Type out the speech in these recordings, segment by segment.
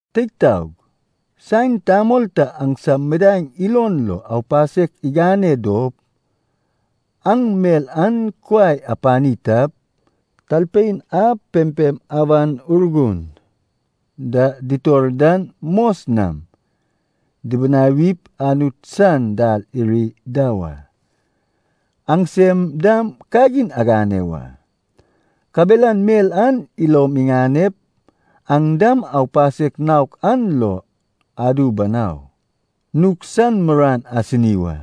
Teig taog, saen tamol ta aŋsam midaeŋ ilon lo aupasek igane dop aŋ mel an kuai apani tap, talpein a pempem Awan Urgun da ditor dan mos nam dibinawip Anut san dal iri da wa. Aŋsem dam kagin agane wa, kabelan mel an ilom iŋanep, aŋ dam aupasek naok an lo adu banau. Nug san muruan asini wa,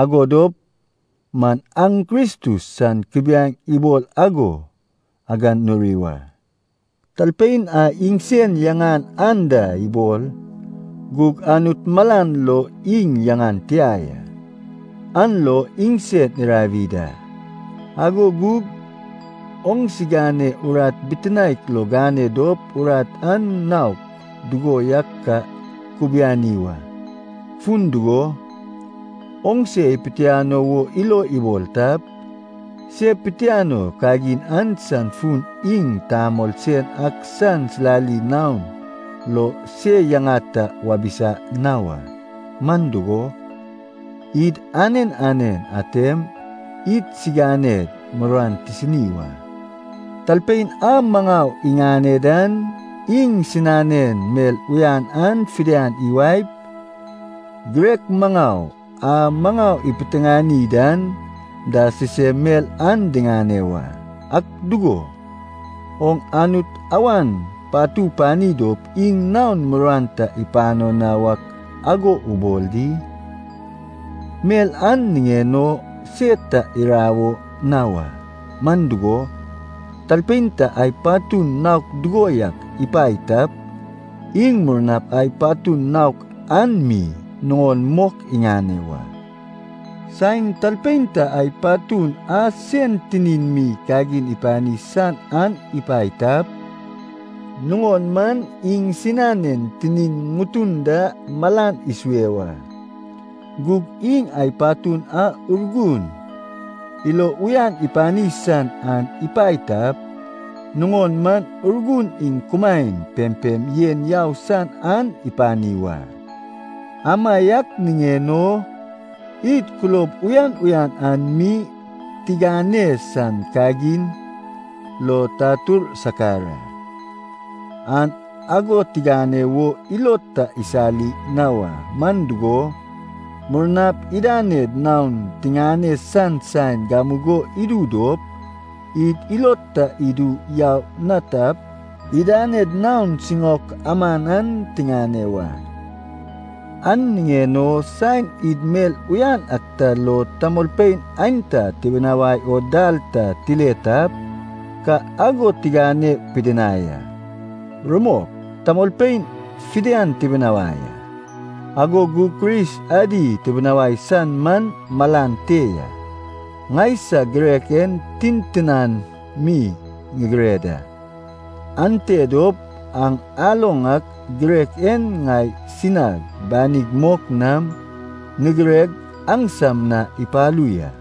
ago dop man aŋ Kristus san kubiaeŋ ibol ago aganuri wa. Talpein a iŋsen yaŋan anda ibol, gug Anut malan lo iŋ yaŋan tia ya, an lo iŋsen irawi da. Ago gug oŋsigane urat bitinaek lo gane dop urat an naok dugo yak ka kubiani wa. Fun dugo, oŋse ipitiano wo ilo ibol tap, se pitianoi kagin an san fun iŋ tamol sen ak san silali naon lo se yaŋa ta wabisa na wa. Man dugo, id anen anen atem idsiganed muruan tisini wa. Talpein a maŋau iŋane dan, iŋsinanen mel uyan an fidian iwaep, girek maŋau a maŋau ipiteŋani dan da sisem mel an diŋane wa. Ak dugo, oŋ Anut awan patu pani dop iŋ naon muruan ta ipano na wak ago ubol di? Mel an niŋen o se ta irawo na wa. Man dugo, talpein ta ai patun naok dugo yak ipae tap, iŋ murnap ai patun naok an mi nuŋon mok iŋane wa. Saen talpein ta ai patun a sen tinin mi kagin ipani san an ipae tap, nuŋon man iŋsinanen tinin ŋutun da malan isue wa. Gug iŋ ai patun a Urgun ilo uyan ipani san an ipae tap, nuŋon man Urgun iŋ kumaen pempem yen yau san an ipani wa. Amaiak niŋen o id kulob uyan uyan an mi tigane san kagin lo tatur sakar a. An ago tigane wo ilod ta isali na wa. Man dugo, murnap idaned naon tiŋane san saen gamugo idu dop, id ilod ta idu yau na tap, idaned naon siŋaok aman an tiŋane wa. An niŋen o saen id mel uyan ak ta lo tamolpein aenta tibinawai o dal ta tile tap, ka ago tigane pidinai a. Rumok, tamolpein fidian tibinawai a, ago gug Kris adi tibinawai san man malan te ya. Ŋaisag girek en tintinan mi ŋigire da, ante dop aŋ aloŋ ak girek en ŋai sinag banig mok nam ŋigireg aŋsam na ipalu ya.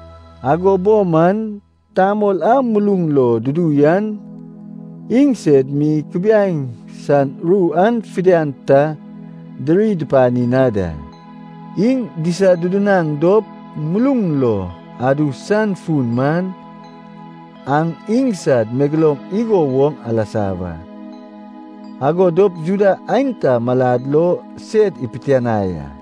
Ago bo man, tamol a muluŋ lo dudu yan iŋsed mi Kubiaeŋ san ru an fidian ta diri dupani na da. Iŋ disadudunaŋ dop muluŋ lo adu san fun man, aŋ iŋsad megeloum igo woŋ alasa wa, ago dop Juda aenta malad lo sed ipitianai a.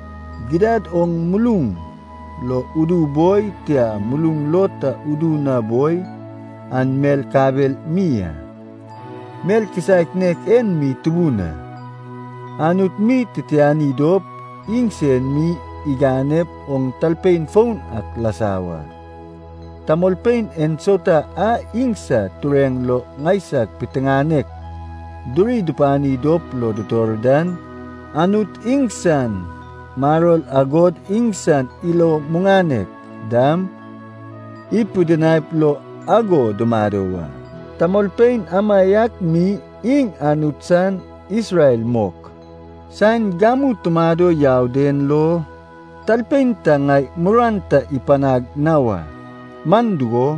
Gidad oŋ muluŋ lo udu boi, tia muluŋ lo ta udu na boi, an mel kabel mi a. Mel kisaek nek en mi tubun a, Anut mi titiani dop, iŋsen mi iganep oŋ talpein foun ak lasa wa. Tamolpein ensauta a iŋsad tureŋ lo ŋaisag piteŋanek duri dupani dop lo dutor dan, Anut iŋsan maror agod iŋsan ilo muŋanek dam, ipidinaip lo ago dumado wa. Tamolpein amaiak mi iŋ Anut san Isrel mok. Saen gamu tumado yau den lo talpein ta ŋai muruan ta ipanag na wa. Man dugo,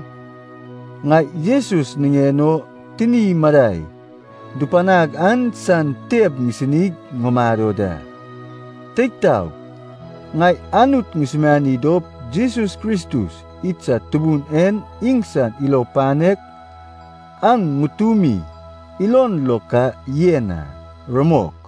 ŋai Jesus niŋen o tini madai dupanag an san teb ŋisinig ŋumado da. Teig taog, ŋai Anut ŋusumiani dop Jesus Kristus idsad Tubun en iŋsan ilo panek aŋ ŋutumi ilon lo ka yen a. Rumok.